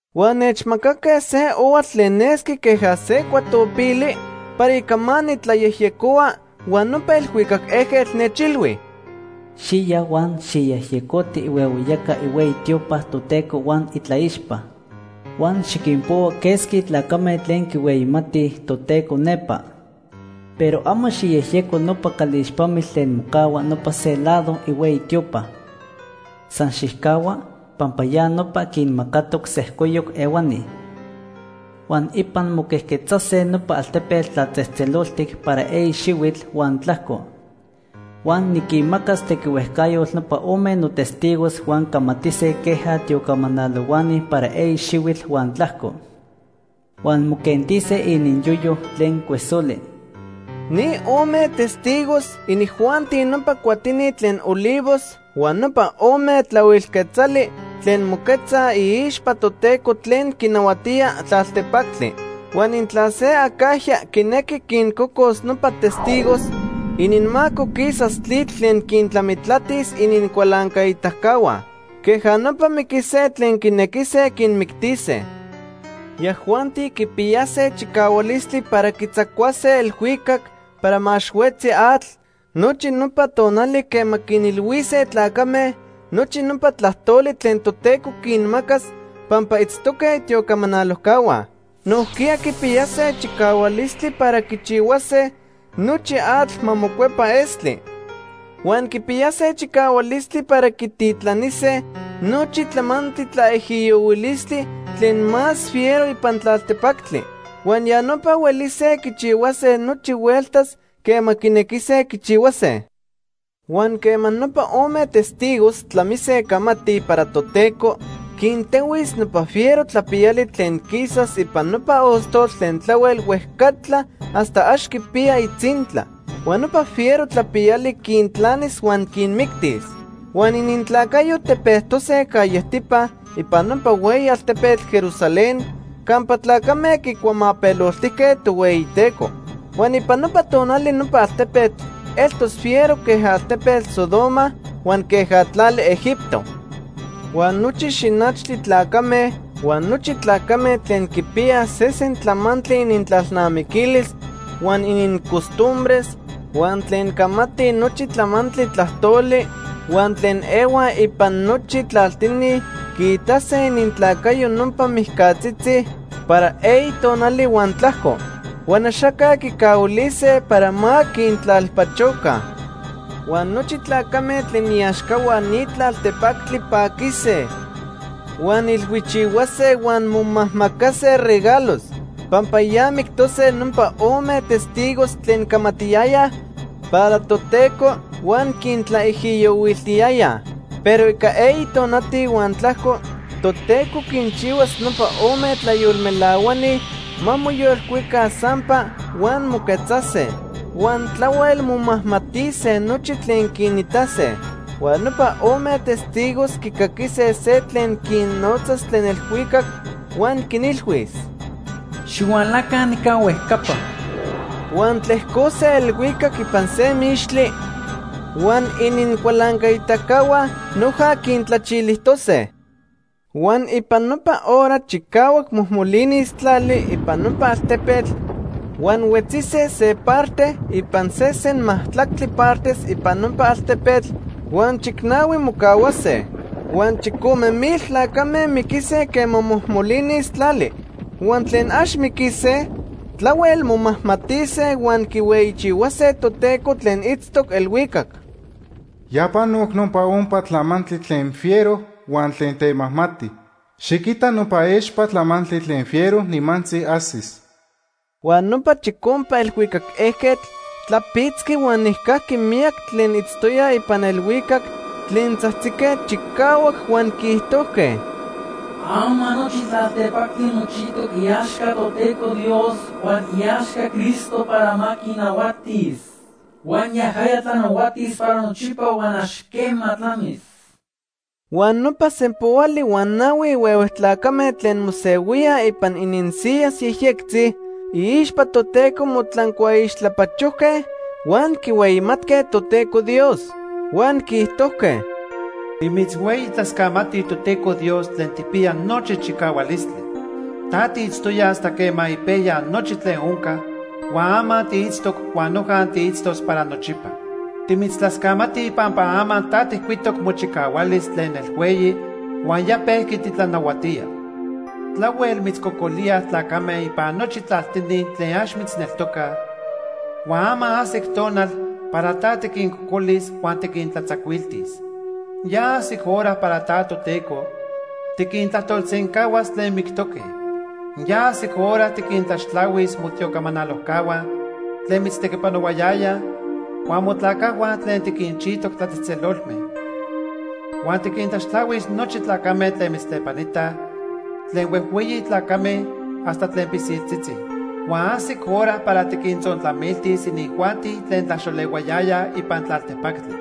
Huan nechmacaque se ohuatl tlen nesqui queja se cuatopili para ica ma nitlayejyecohua, huan nopa elhuicac ejquetl nechilhui: “Xiya huan xijyejyecoti ihuehueyaca ihueyi tiopa Toteco huan itlaixpa. Huan xiquinpohua quesqui tlacame tlen quihueyimatij Toteco nepa. Pero amo xijyejyeco nopa calixpamitl tlen mocahua nopa se lado ihueyi tiopa. San xijcahua, pampa ya nopa quinmacatoc sejcoyoc ehuani. Huan ipan moquejquetzase nopa altepetl tlatzejtzeloltic para eyi xihuitl huan tlajco. Huan niquinmacas tequihuejcayotl nopa ome notestigos huan camatise queja tiocamanalohuani para eyi xihuitl huan tlajco. Huan moquentise ininyoyo tlen cuesoli.” Ni ome testigos, inijuanti nopa cuatini tlen olivos huan nopa ome tlahuil quetzali tlen moquetzaj iixpa Toteco tlen quinahuatía tlaltepactli. Huan intla se acajya quinequi quincocos nopa testigos, inincamaco quisas tlitl tlen quintlamitlatis inincualancaitacahua. Queja nopa miquise tlen quinequise quinmictise. Yajuanti quipiyase chicahualistli para quitzacuase elhuicac para ma ax huetzi atl nochi nopa tonali quema quinilhuise tlacame nochi nopa tlajtoli tlen Toteco quinmacas pampa itztoque itiocamanalojcahua. Nojquiya quipiyase chicahualistli para quichihuase nochi atl ma mocuepa estli. Huan quipiyase chicahualistli para quititlanise nochi tlamantli tlaijiyohuilistli tlen más fiero ipan tlaltepactli. Huan ya nopa huelise quichihuase nochi hueltas quema quinequise quichihuase. Huan quema nopa ome testigos tlamise camatij para Toteco, quintehuis nopa fiero tlapiyali tlen quisas ipan nopa ostotl tlen tlahuel huejcatla hasta ax quipiya itzintla. Huan nopa fiero tlapiyali quintlanis huan quinmictis. Huan inintlacayo tepejtose callejtipa ipan nopa hueyi altepetl Jerusalén campa tlacame quicuamapeloltijque Tohueyiteco. Huan ipan nopa tonali nopa altepetl eltos fiero queja altepetl Sodoma huan queja tlali Egipto. Huan nochi xinachtli tlacame, huan nochi tlacame tlen quipiyaj sesen tlamantli inintlalnamiquilis huan inincostumbres, huan tlen camatij nochi tlamantli tlajtoli, huan tlen ehuaj ipan nochi tlaltini quiitase inintlacayo nopa mijcatzitzi para eyi tonali huan tlajco. Huan axaca quicahuilise para ma quintlalpachoca. Huan nochi tlacame tlen iaxcahua ni tlaltepactli paquise, huan ilhuichihuase huan momajmacase regalos, pampa ya mictose nopa ome testigos tlen camatiyayaj para Toteco huan quintlaijiyohuiltiyayaj. Pero ica eyi tonati huan tlajco Toteco quinchihuas nopa ome tlayolmelahuani ma moyolcuica sampa huan moquetzase. Huan tlahuel momajmatise nochi tlen quinitase. Huan nopa ome testigos quicaquise se tlen quinnotzas tlen elhuicac, huan quinilhuis: “Xihualaca nica huejcapa.” Huan tlejcose elhuicac ipan se mixtli, huan inincualancaitacahua noja quintlachilijtose. Huan ipan nopa hora chicahuac mojmolinis tlali ipan nopa altepetl huan huetzise se parte ipan sesen majtlactli partes ipan nopa altepetl huan chicnahui mocahuase. Huan chicome mil tlacame miquise quema mojmolinis tlali. Huan tlen ax miquise tlahuel momajmatise huan quihueyichihuase Toteco tlen itztoc elhuicac. Ya panoc nopa ompa tlamantli tlen fiero huan tlen temajmati. Xiquita nopa expa tlamantli tlen fiero nimantzi ajsis. Huan nopa chicompa elhuicac ejquetl tlapitzqui huan nijcajqui miyaqui tlen itztoyaj ipan elhuicac tlen tzajtzique chicahuac, huan quiijtojque: “Ama nochi tlaltepactli mochijtoc iaxca Toteco Dios huan iaxca Cristo para ma quinahuatis. Huan yajaya tlanahuatis para nochipa huan ax quema tlamis.” Huan nopa sempoali huan nahui huehue tlacame tlen mosehuíaj ipan ininsiyas yejyectzitzi iixpa Toteco motlancuaixtlapachojque huan quihueyimatque Toteco Dios. Huan quiijtojque: “Timitzhueyitlascamatij Toteco Dios tlen tijpiya nochi chicahualistli. Ta tiitztoya hasta quema ipejya nochi tlen onca huan ama tiitztoc huan noja tiitztos para nochipa. Timitztlascamatij pampa ama ta tijcuitoc mochicahualis tlen nelhueyi huan ya pejqui titlanahuatía. Tlahuel mitzcocolíaj tlacame ipan nochi tlaltini tlen ax mitzneltocaj, huan ama ajsic tonal para ta tiquincocolis huan tiquintlatzacuiltis. Ya ajsic hora para ta, Toteco, tiquintlajtolsencahuas tlen mictoque. Ya ajsic hora tiquintlaxtlahuis motiocamanalojcahua tlen mitztequipanohuayayaj, huan motlacajhua tlen tiquinchijtoc tlatzejtzelolme. Huan tiquintlaxtlahuis nochi tlacame tlen mitztlepanitaj tlen huejhueyi tlacame hasta tlen pilsiltzitzi. Huan ajsic hora para tiquintzontlamiltis inijuanti tlen tlaxolehuayayaj ipan tlaltepactli.”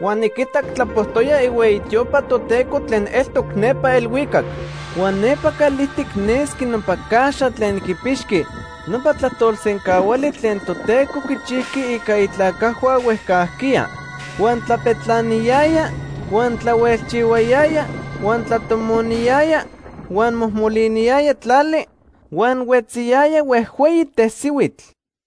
Huan niquitac tlapojtoya ihueyi tiopa Toteco tlen eltoc nepa elhuicac. Huan nepa calijtic nesqui nopa caxa tlen quipixqui nopa tlajtolsencahuali tlen Toteco quichijqui ica itlacajhua huejcajquiya. Huan tlapetlaniyaya, huan tlahuelchihuayaya, huan tlatomoniyaya, huan mojmoliniyaya tlali, huan huetziyaya huejhueyi tesihuitl.